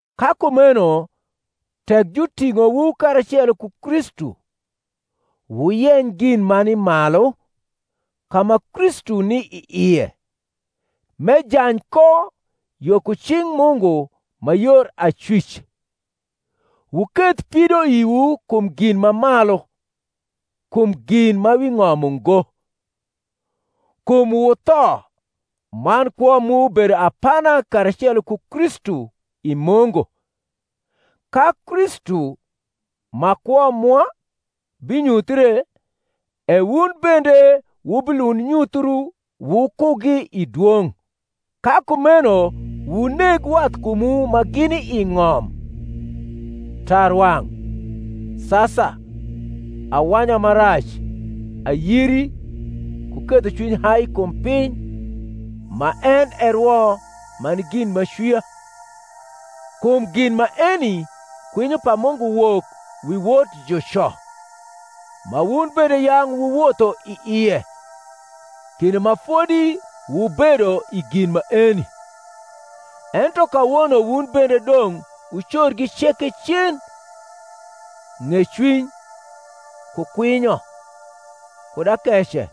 Ka kumeno tek juting’owu karacelo ku Kristu, wuyeny gin ma ni malu, ka ma Kristu ni i ie, m’ejany ko yo ku cing’ Mungu ma yor acwic. Wuketh pidoiwu kum gin ma malu, kum gin ma wi ng’om ungo. Kum wutho, man kwo mu bedo apana karacelo ku Kristu i Mungu. Ka Kristu, ma kwo mwa, binyuthie, e wun bende wubilund nyuthiu wukugi i dwong’. Ka kumeno wuneg wathkumwu ma gini i ng’om: tarwang’, sasa, awanya ma rac, ayiri, ku ketho cwiny hai kum piny, ma en e rwo ma ni gin m’acwia; kum gin maeni kwinyo pa Mungu wok wi wot juco: ma wun bende yang’ wuwotho i ie, kinde ma fodi wubedo i gin maeni; ento kawono wun bende dong’ wucorgi ceke cen: ng’ecwiny, ku kwinyo, kud akece,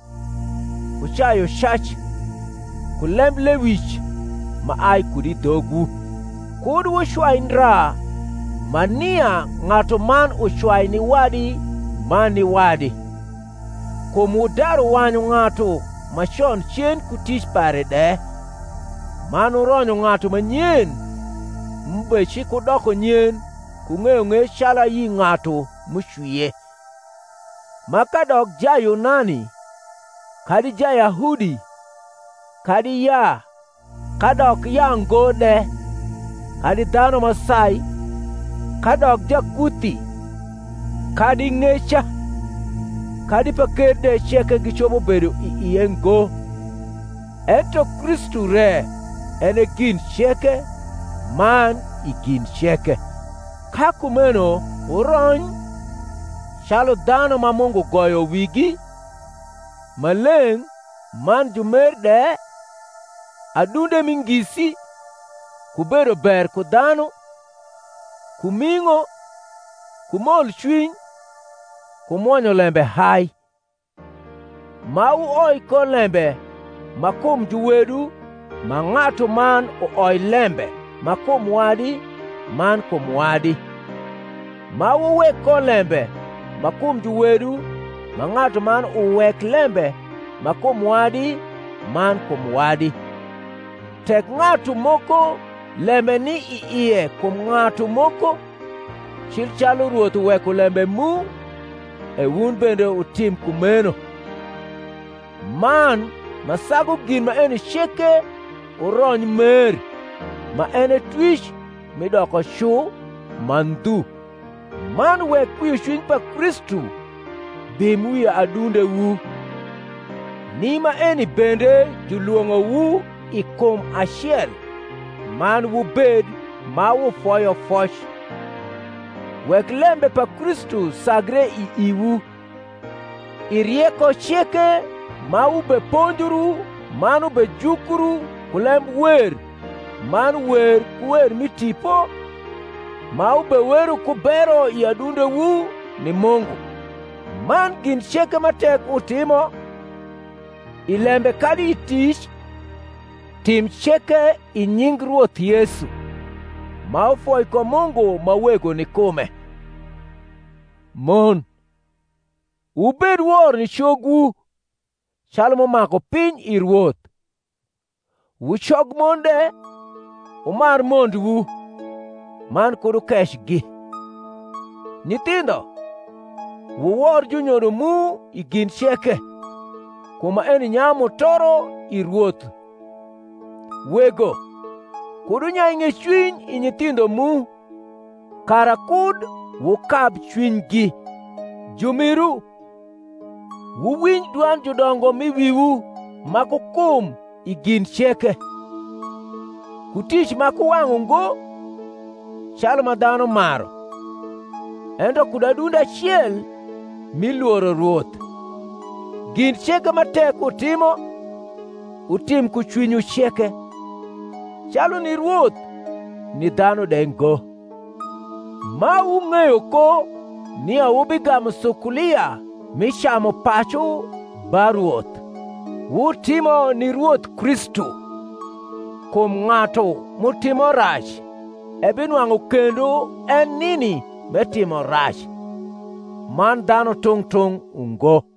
ku cayucac, ku lemblewic ma ai kud i dhogwu: kud wucwai ndra ma nia ng’atuman ucwai ni wadi man ni wadi: kum wudaru wanyu ng’atu ma con cen ku tic pare de, man wuronyo ng’atu ma nyen, m’ubecikudoko nyen ku ng’eyong’ec calu ayi ng’atu m’ucwie:. ma kadok Jayunani kadi Jayahudi, kadi yaa, kadok yaango de, kadi dhanu ma sai, kadok Jakuthi, kadi ng’eca, kadi paker de ceke gicopo bedo i ie ngo; ento Kristu re en e gin ceke, man i gin ceke. Ka kumeno wurony, calu dhanu ma Mungu goyo wigi, ma leng’ man jumer de, adunde mi ngisi, ku bedo ber ku dhanu, ku ming’o, ku molcwiny, ku mwonyo lembe hai; ma wuoi ko lembe ma kum juwedu ma ng’atuman uoi lembe ma kum wadi man kum wadi, ma wuwek ko lembe ma kum juwedu ma ng’atuman uwek lembe ma kum wadi man kum wadi, tek ng’atu moko lembe ni i ie kum ng’atu moko: cil calu Rwoth uweko lembe mu, e wun bende wutim kumeno: man ma sagu gin maeni ceke wurony mer, ma en e twic mi doko cu ma ndhu. Man wek kwiocwiny pa Kristu bim wi adundewu, ni maeni bende julwong’owu i kum acel: man wubed ma wufoyo foc. Wek lembe pa Kristu sagre i iwu; i rieko ceke ma wubeponjru man wubejukru ku lembwer man wer ku wer mi tipo, ma wubewero ku bero i adundewu ni Mungu. Man gin ceke ma tek wutimo, i lembe kadi i tic, tim ceke i nying Rwoth Yesu, ma wufoi ko Mungu ma Wego ni kume. Mon, wubed wor ni cogwu, calu m’umaku piny i Rwoth. Wu cogmon de, wumar mondwu, man kud wukecgi. Nyithindho, wuwor junyodo mu i gin ceke, kum maeni nyayu mutoro i Rwoth. Wego, kud wunyai ng’ecwiny i nyithindho mu, kara kud wukab cwinygi. Jumiru, wuwinj dwand judongo m’i wiwu ma ku kum i gin ceke; ku tic ma ku wang’ ungo, calu ma dhanu maru, ento kud adunde acel, mi lworo Rwoth: gin ceke ma tek wutimo, wutim ku cwinywu ceke, calu ni Rwoth, ni dhanu de ngo; ma wung’eyo ko nia wubigamu sukulia mi camupacu ba Rwoth: wutimo ni Rwoth Kristu. Kum ng’atu m’utimo rac ebinwang’u kendo en nini m’etimo rac: man dhanu tung’ tung’ ungo.